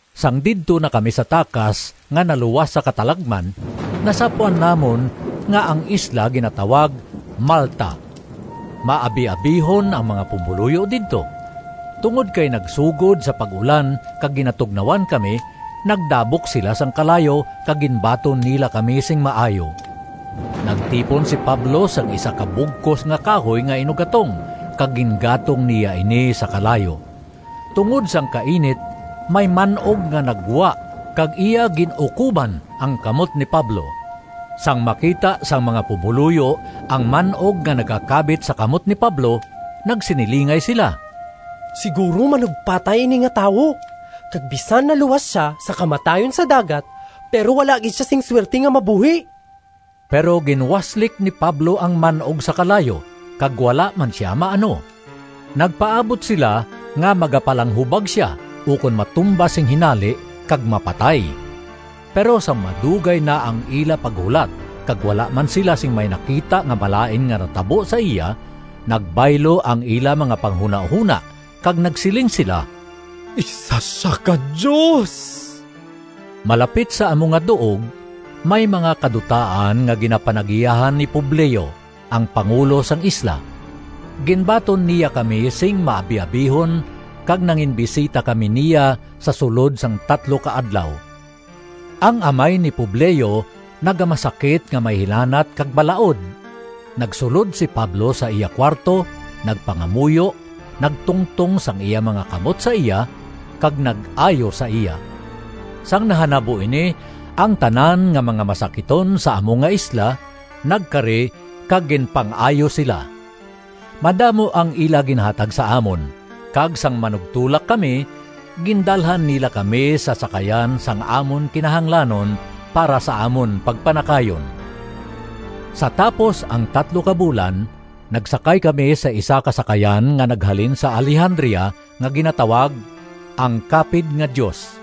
Sang didto na kami sa takas nga naluwas sa katalagman, nasapwan namon nga ang isla ginatawag Malta. Maabiabihon ang mga pumoluyo didto. Tungod kay nagsugod sa pag-ulan kag ginatugnawan kami, nagdabok sila sing kalayo kag ginbaton nila kami sing maayo. Nagtipon si Pablo sing isa ka bugkos nga kahoy nga inuggatong kag gingatong niya ini sa kalayo. Tungod sang kainit may man-og nga naggwa kag iya gin-ukoban ang kamot ni Pablo. Sang makita sang mga pumoluyo ang man-og nga nagakabit sa kamot ni Pablo, nagsinilingay sila, “Siguro manugpatay ini nga tawo, kag bisan naluwas sia sa kamatayon sa dagat, pero wala gid sia sing suwerte nga mabuhi.” Pero ginwaslik ni Pablo ang man-og sa kalayo kag wala man sia maano. Nagpaabot sila nga magapalanghubag sia ukon matumba sing hinali kag mapatay. Pero sang madugay na ang ila paghulat kag wala man sila sing may nakita nga malain nga natabo sa iya, nagbaylo ang ila mga panghunahona kag nagsiling sila, “Isa sia ka dios!” Malapit sa amo nga duog may mga kadutaan nga ginapanag-iyahan ni Publio, ang pangulo sang isla. Ginbaton niya kami sing maabiabihon kag nanginbisita kami niya sa sulod sang tatlo ka adlaw. Ang amay ni Publio nagamasakit nga may hilanat kag balaod. Nagsulod si Pablo sa iya kuwarto, nagpangamuyo, nagtungtong sang iya mga kamot sa iya, kag nag-ayo sa iya. Sang nahanabo ini, ang tanan nga mga masakiton sa amo nga isla nagkari kag ginpang-ayo sila. Madamo ang ila ginhatag sa amon, kag sang manugtulak kami, gindalhan nila kami sa sakayan sang amon kinahanglanon para sa amon pagpanakayon. Sa tapos ang tatlo ka bulan nagsakay kami sa isa ka sakayan nga naghalin sa Alejandria nga ginatawag, “Ang Kapid nga Dios.”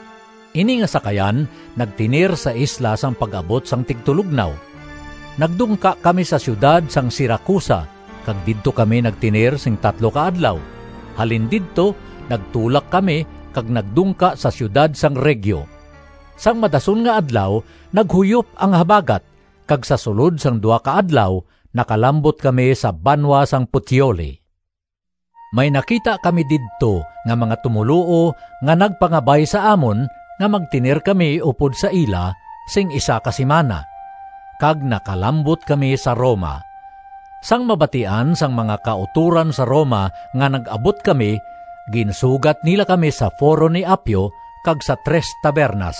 Ini nga sakayan nagtener sa isla sang pag-abot sang tigtulognaw. Nagdungka kami sa siyudad sang Siracusa kag didto kami nagtener sing tatlo ka adlaw. Halin didto nagtulak kami kag nagdungka sa siyudad sang Regio. Sang madason nga adlaw naghuyop ang habagat, kag sa sulod sang duha ka adlaw, nakalambot kami sa banwa sang Puteoli. May nakita kami didto nga mga tumoluo nga nagpangabay sa amon nga magtener kami upod sa ila sing isa ka simana. Kag nakalambot kami sa Roma. Sang mabatian sang mga kautoran sa Roma nga nag-abot kami ginsugat nila kami sa Foro ni Appio kag sa Tres Tavernas.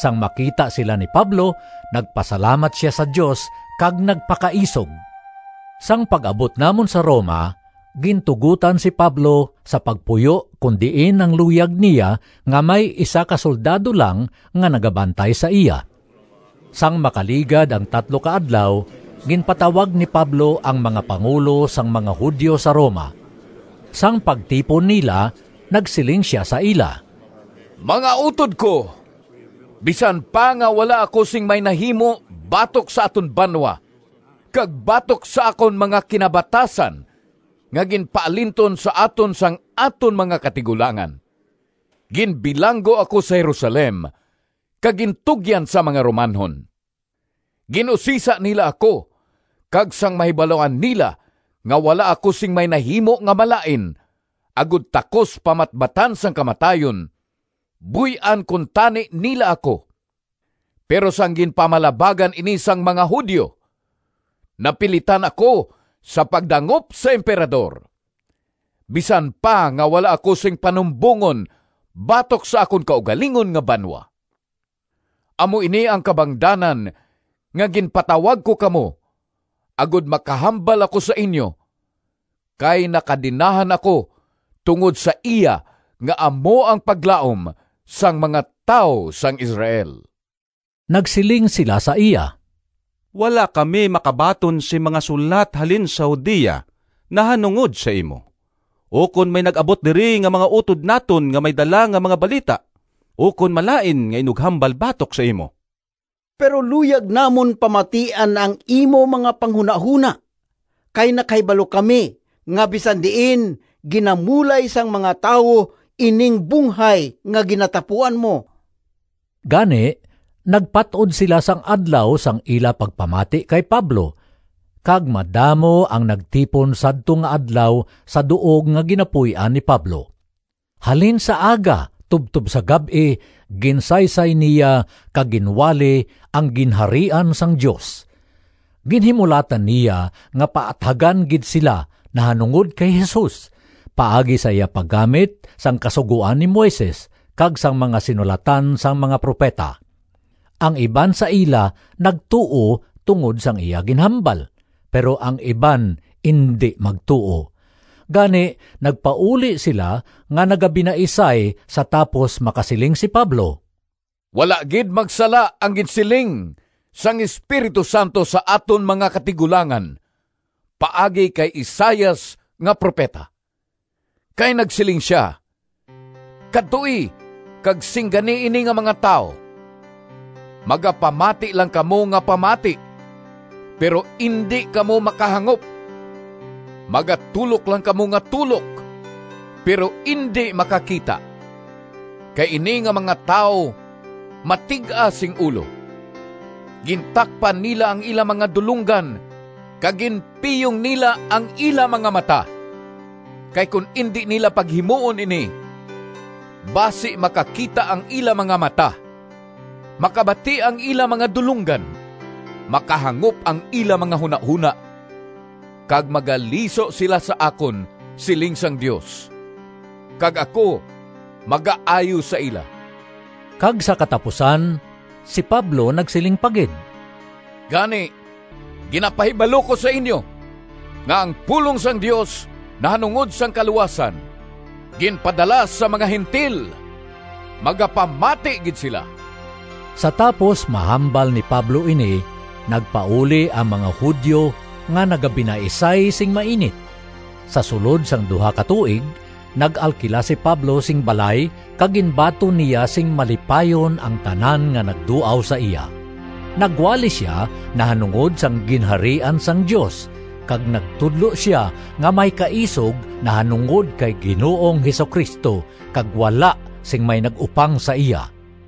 Sang makita sila ni Pablo, nagpasalamat sia sa Dios kag nagpakaisog. Sang pag-abot namon sa Roma, gintugotan si Pablo sa pagpuyo kon diin ang luyag niya nga may isa ka soldado lang nga nagabantay sa iya. Sang makaligad ang tatlo ka adlaw, ginpatawag ni Pablo ang mga pangulo sang mga Judio sa Roma. Sang pagtipon nila nagsiling sia sa ila, “Mga utod ko! Bisan pa nga wala ako sing may nahimo batok sa aton banwa kag batok sa akon mga kinabatasan nga ginpaalinton sa aton sang aton mga katigulangan, ginbilanggo ako sa Jerusalem kag gintugyan sa mga Romanhon. Gin-usisa nila ako kag sang mahibaluan nila nga wala ako sing may nahimo nga malain agod takos pamatbatan sang kamatayon buy-an kuntani nila ako. Pero sang ginpamalabagan ini sang mga Judio, napilitan ako sa pagdangop sa Emperador, bisan pa nga wala ako sing panumbongon batok sa akon kaugalingon nga banwa. Amo ini ang kabangdanan nga ginpatawag ko kamo agod makahambal ako sa inyo, kay nakadenahan ako tungod sa iya nga amo ang paglaom sang mga tawo sang Israel.” Nagsiling sila sa iya, “Wala kami makabaton sing mga sulat halin sa Judea nahanungod sa imo, ukon may nag-abot diri nga mga utod naton nga may dala nga mga balita ukon malain nga inughambal batok sa imo. Pero luyag namon pamatian ang imo mga panghunahona, kay nakahibalo kami nga bisan diin ginamulay sang mga tawo ining bunghay nga ginatapuan mo.” Gani nagpat-od sila sang adlaw sang ila pagpamati kay Pablo kag madamo ang nagtipon sadto nga adlaw sa duog nga ginapuy-an ni Pablo. Halin sa aga tubtob sa gab-i ginsaysay niya kag ginwali ang Ginharian sang Dios. Ginhimulatan niya nga paathagan gid sila nahanungod kay Jesus, paagi sa iya paggamit sang Kasugoan ni Moises kag sang mga sinulatan sang mga propeta! Ang iban sa ila nagtuo tungod sang iya ginhambal, pero ang iban indi magtuo. Gani nagpauli sila nga nagabinaisay sa tapos makasiling si Pablo, “Wala gid magsala ang ginsiling sang Espiritu Santo sa aton mga katigulangan paagi kay Isaias nga propeta! Kay nagsiling sia: ‘Kadtoi kag singgani ini nga mga tawo, Magapamati lang kamo nga pamati, Pero indi kamo makahangop, Magatulok lang kamo nga tulok, Pero indi makakita. Kay ini nga mga tawo matig-a sing ulo. Gintakpan nila ang ila mga dulonggan, Kag ginpiyong nila ang ila mga mata. Kay kon indi nila paghimuon ini, Basi makakita ang ila mga mata, Makabati ang ila mga dulonggan, Makahangop ang ila mga hunahona, Kag magaliso sila sa akon, Siling sang Dios, Kag ako magaayo sa ila.’” Kag sa katapusan si Pablo nagsiling pa gid, “Gani ginapahibalo ko sa inyo nga ang pulong sang Dios nahanungod sang kaluwasan, ginpadala sa mga Gentil. Magapamati gid sila!” [ Sa tapos mahambal ni Pablo ini, nagpauli ang mga Judio nga nagabinaisay sing mainit.] Sa sulod sang duha ka tuig, nag-alkila si Pablo sing balay kag ginbaton niya sing malipayon ang tanan nga nagduaw sa iya. Nagwali sia nahanungod sang Ginharian sang Dios kag nagtudlo sia nga may kaisog nahanungod kay Ginoong Jesu-Cristo, kag wala sing may nag-upang sa iya.